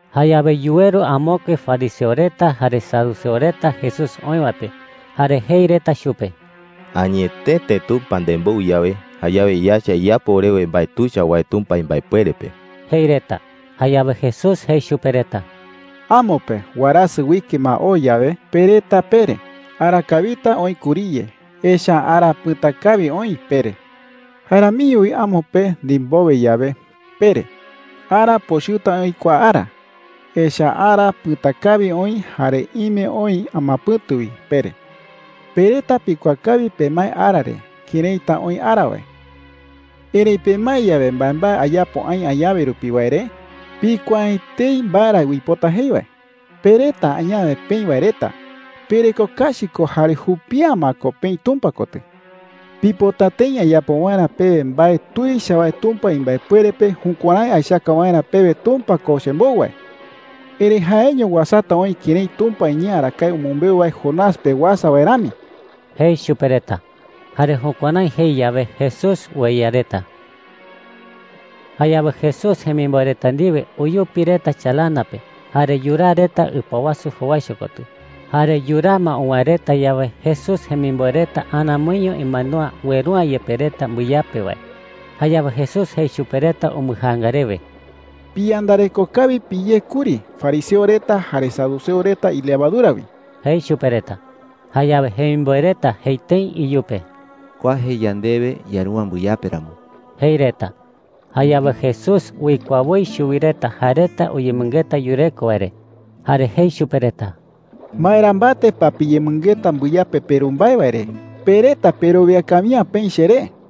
Jayawe yuweru amokue fariseo reta jare saduceo reta Jesús oï wae pe, jare jei reta chupe: “Añetete Tumpa nembou yawe, jayawe yaecha iyapo orewe mbae tuicha wae Tumpa imbaepuere pe,” jei reta. Jayawe Jesús jei chupe reta: “Amo pe warasɨ uike ma oo yawe, pe reta pere: ‘Ara kawita oï kuriye, echa’ä ara pɨ̈ta kawi oï,’ pere. Jae ramiño wi amo pe ndimbowe yawe, pere: ‘Ara pochɨta oï kua ara, echa’ä ara pɨ̈ta kawi oï jare ime oï amapɨ̈tu wi,’ pere,” jei. “Pe reta pikuaa kawi pemae ara re këraita oï ara wae. Erëi pemae yawe mbaembae ayapo aï añawe rupi wae re, pikuaa’ä etei mbae ra uipota jei wae,” jei chupe reta. “Pe reta añawe peï wae reta, pereko kachi ko jare jupi’ä ma ko peï Tumpa kotɨ,” jei chupe reta. “Pipota tëi ayapo waerä pewe mbae tuicha wae Tumpa imbaepuere pe jukuärái aechaka waerä pewe Tumpa ko chembou wae. Erëi jaeño uasata oï kërái Tumpa iñee arakae umɨmbeu wae Jonás pe uasa wae rami,” jei chupe reta. Jare jukuärái jei yawe, Jesús ueya reta. Jayawe Jesús jemimboe reta ndiwe uyupi reta chalana pe jare yuraa reta ɨpa wasu jowaicho kotɨ. Jare yuraa ma uwäe reta yawe, Jesús jemimboe reta aramoiño imandúa ueru’ä yepe reta mbɨyape wae. Jayawe Jesús jei chupe reta umbɨjaanga rewe: “Piyandareko kawi piyé kuri fariseo reta jare saduceo reta ilevadura wi,” jei chupe reta. Jayawe jemimboe reta jei tëi iyupe: “Kua jei yandewe yaru’ä mbɨyape ramo,” jei reta. Jayawe Jesús uikuaa woi chuwi reta jae reta uyemɨngeta yureko wae re, jare jei chupe reta: “¿Maera mbate pa piyemɨngeta mbɨyape peru mbae wae re? Pe reta perowia kawi’ä peï cheré,” jei.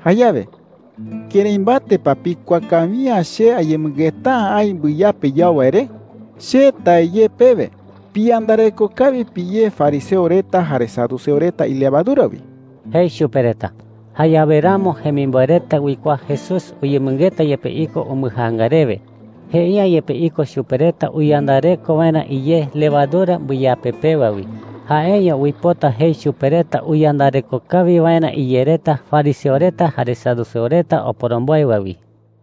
“Jayawe ¿kërái mbate pa pikuaa kawi’ä che ayemɨngeta’ä aï mbɨyape yau wae re? Che tae ye pewe, piyandareko kawi piyé fariseo reta jare saduceo reta ilevadura wi,” jei chupe reta. Jayawe ramo jemimboe reta uikuaa Jesús uyemɨngeta yepe iko umbɨjaanga rewe. Jei’ä yepe iko chupe reta uyandareko waerä iyé levadura mbɨyape pewa wi. Jaeño uipota jei chupe reta uyandareko kawi waerä iyé reta fariseo reta jare saduceo reta oporomboe wae wi.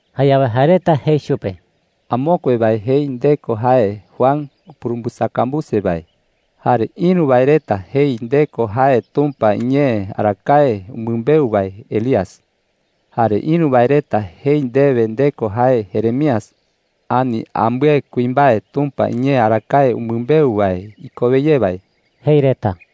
Jayawe jae reta jei chupe: “Amokue wae jei nde ko jae Juan upurumbɨsakambuse wae. Jare ïru wae reta jei nde ko jae Tumpa iñee arakae umɨmbeu wae Elías. Jare ïru wae reta jei nde ko jae Jeremías, ani ambɨe kuimbae Tumpa iñee arakae umɨmbeu wae ikowe ye wae,” jei reta.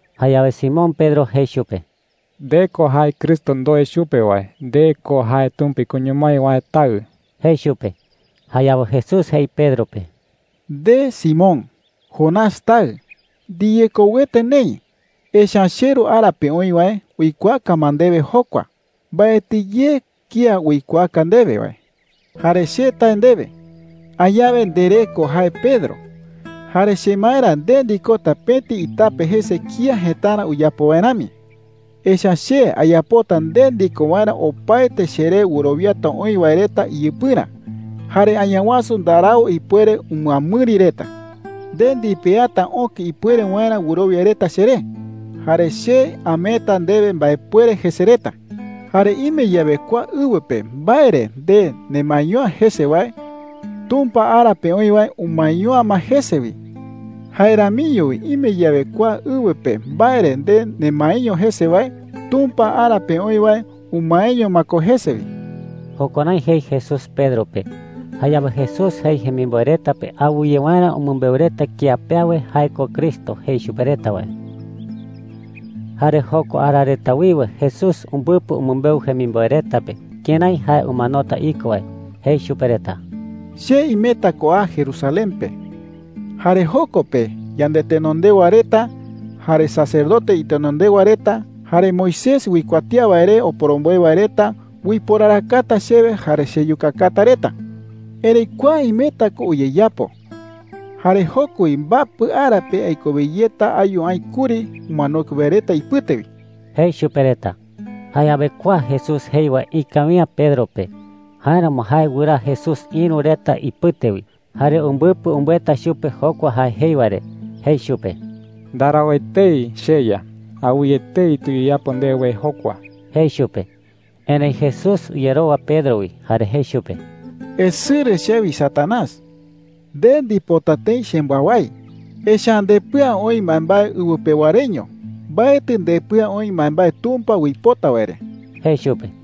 Jayawe Simón Pedro jei chupe: “Nde ko jae Cristo ndoe chupe wae. Nde ko jae Tumpa ikoño mái wae Taɨ,” jei chupe. Jayawe Jesús jei Pedro pe: “Nde Simón, Jonás taɨ, ndiyekouete neï. Echa’ä cheRu ara pe oï wae uikuaaka ma ndewe jokua. Mbaetɨ ye kía uikuaaka ndewe wae,” jei chupe. “Jare che tae ndewe, añawe nderee ko jae Pedro. Tee Pedro uipota jei “itape” jae reta iñee pe. Jare chemaerä nde ndikota pëti itape jese kía jëtarä uyapo wae rami. Echa’ä che ayapota nde ndiko waerä opaete cheré wɨrowiata oï wae reta iyɨpɨrä. Jare Añawasu ndarau ipuere umɨamɨri reta,” jei. “Nde ndipeata öke ipuere waerä wɨrowia reta cheré, jare che ameeta ndewe mbaepuere jese reta,” jei chupe. “Jare ime yawe kua ɨwɨ pe mbae re nde nemaeño’ä jese wae, Tumpa ara pe oï wae umaeño’ä ma jese wi. Jae ramiño wi ime yawe kua ɨwɨ pe mbae re nde nemaeño jese wae, Tumpa ara pe oï wae umaeño ma ko jese wi.” Jukuärái jei Jesús Pedro pe. Jayawe Jesús jei jemimboe reta pe awɨye waerä umɨmbeu reta kía pe awe jae ko Cristo jei chupe reta wae. Jare jokua ara reta wiwe Jesús umbɨpɨ umɨmbeu jemimboe reta pe kërái jae umanota iko wae. Jei chupe reta: “Che imeta ko a Jerusalén pe. Jare joko pe yandetenondewa reta, jare sacerdote itenondewa reta, jare Moisés uikuatía wae re oporomboe wae reta uiporarakata chewe jare cheyukakata reta,” jei. “Erëi kua imeta ko uyeyapo. Jare joko wi mbapɨ ara pe aikowe yeta ayu aï kuri umanokue wae reta ipɨte wi,” jei chupe reta. Jayawe kua Jesús jei wae ikawi’ä Pedro pe. Jáeramo jae wɨraa Jesús ïru reta ipɨte wi, jare umbɨpɨ umbɨeta chupe jokua jae jei wae re. Jei chupe: “¡Ndarau etei, cheYa! Awɨye etei tuyeyapo ndewe jokua,” jei chupe. Erëi Jesús uyerowa Pedro wi, jare jei chupe: “Esɨrɨ chewi, Satanás,” jei chupe. “Nde ndipota tëi chembɨawái, echa’ä ndepɨa oï mbaembae ɨwɨ pewa reño. Mbaetɨ ndepɨa oï mbaembae Tumpa uipota wae re,” jei chupe.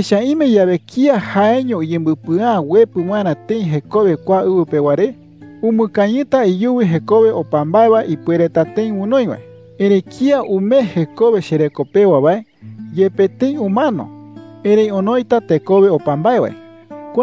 “Echa’ä ime yawe kía jaeño uyembɨpɨa’ä uepɨ waerä tëi jekowe kua ɨwɨ pewa re, umɨkañɨta iyuwi jekowe opa mbae wae ipuereta tëi onoi wae. Erëi kía umee jekowe chereko pewa wae, yepe tëi umano, erëi onoita tekowe opa mbae wae,” jei chupe reta.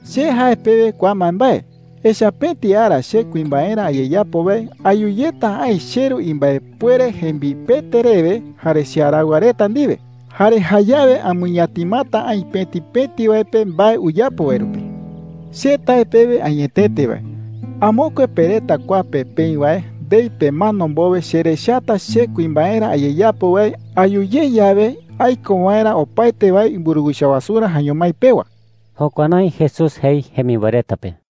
“Che jae pewe kua mbaembae, echa’ä pëti ara che kuimbaerä ayeyapo wae ayu yeta aï cheRu imbaepuere jembipete rewe jare chearaɨwa reta ndiwe. Jare jayawe amɨñatimata aï pëti pëti wae pe mbae uyapo wae rupi,” jei. “Che tae pewe añetete wae, amokue pe reta kua pe peï wae ndei pemano mbowe cherechata che kuimbaerä ayeyapo wae ayu ye yawe aiko waerä opaete wae imburuwicha wasurä jaeño mái pewa.” Jukuärái Jesús jei jemimboe reta pe.